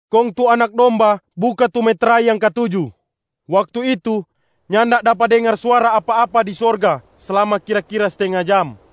Kong tu Anak Domba buka tu metrai yang katuju. Waktu itu, nyanda dapa dengar suara apa-apa di sorga slama kira-kira stenga jam.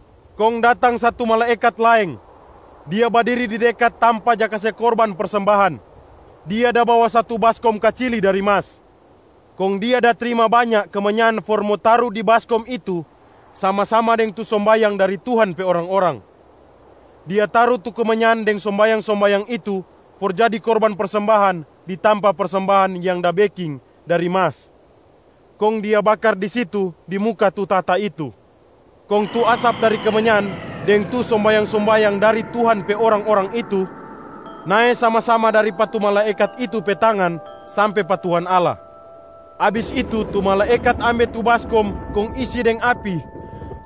Kong datang satu malaekat laeng, dia badiri di dekat tampa ja kase korban persembahan. Dia da bawa satu baskom kacili dari mas, kong dia da trima banya kemenyan for mo taru di baskom itu sama-sama deng tu sombayang dari Tuhan pe orang-orang. Dia taru tu kemenyan deng sombayang-sombayang itu for jadi korban persembahan di tampa persembahan yang da beking dari mas, kong dia bakar di situ di muka tu tahta itu. Kong tu asap dari kemenyan deng tu sombayang-sombayang dari Tuhan pe orang-orang itu, nae sama-sama dari pa tu malaekat itu pe tangan sampe pa Tuhan Allah. Abis itu tu malaekat ambe tu baskom kong isi deng api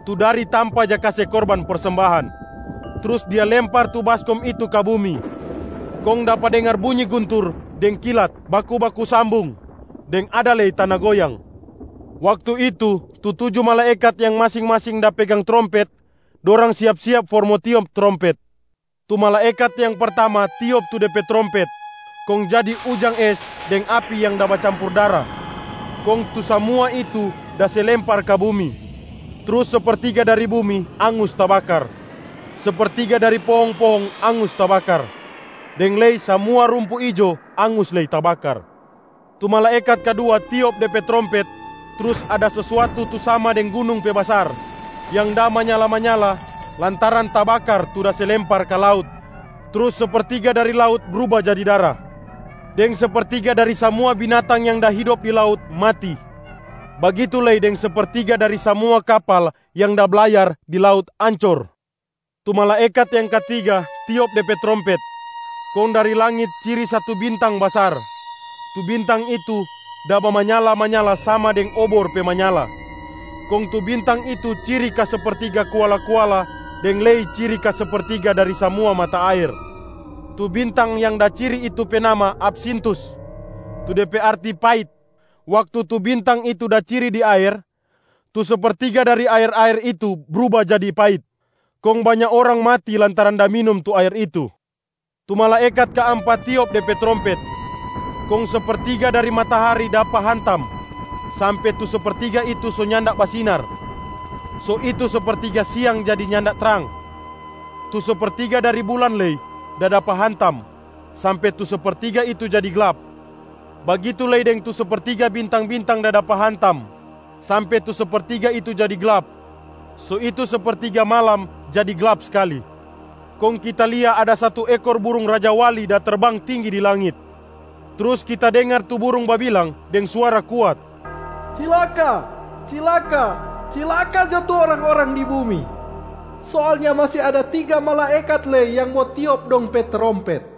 tu dari tampa ja kase korban persembahan, trus dia lempar tu baskom itu ka bumi. Kong dapa dengar bunyi guntur deng kilat baku-baku sambung, deng ada lei tana goyang. Waktu itu tu tuju malaekat yang masing-masing da pegang trompet, dorang siap-siap for mo tiop trompet. Tu malaekat yang pertama tiop tu de pe trompet, kong jadi ujang es deng api yang da bacampur dara, kong tu samua itu da se lempar ka bumi. Trus sepertiga dari bumi angus tabakar, sepertiga dari pohong-pohong angus tabakar, deng lei samua rumpu ijo angus lei tabakar. Tu malaekat kadua tiop de pe trompet, trus ada sesuatu tu sama deng gunung pe basar yang da manyala-manyala lantaran tabakar tu da se lempar ka laut. Trus sepertiga dari laut bruba jadi dara, deng sepertiga dari samua binatang yang da hidop di laut mati, bagitu lei deng sepertiga dari samua kapal yang da blayar di laut ancor. Tu malaekat yang katiga tiop de pe trompet, kong dari langit ciri satu bintang basar. Tu bintang itu da bamanyala-manyala sama deng obor pe manyala, kong tu bintang itu ciri ka sepertiga kuala-kuala deng lei ciri ka sepertiga dari samua mata aer. Tu bintang yang da ciri itu pe nama Apsintus, tu de pe arti pait. Waktu tu bintang itu da ciri di aer, tu sepertiga dari aer-aer itu bruba jadi pait, kong banya orang mati lantaran da minum tu aer itu. Tu malaekat kaampa tiop de pe trompet, kong sepertiga dari matahari dapa hantam sampe tu sepertiga itu so nyanda basinar, so itu sepertiga siang jadi nyanda trang. Tu sepertiga dari bulan lei da dapa hantam sampe tu sepertiga itu jadi glap. Bagitu lei deng tu sepertiga bintang-bintang da dapa hantam sampe tu sepertiga itu jadi glap, so itu sepertiga malam jadi glap skali. Kong kita lia ada satu ekor burung rajawali da terbang tinggi di langit. Trus kita dengar tu burung babilang deng suara kuat, “Cilaka, cilaka, cilaka jo tu orang-orang di bumi! Soalnya masi ada tiga malaekat lei yang mo tiop dong pe trompet.”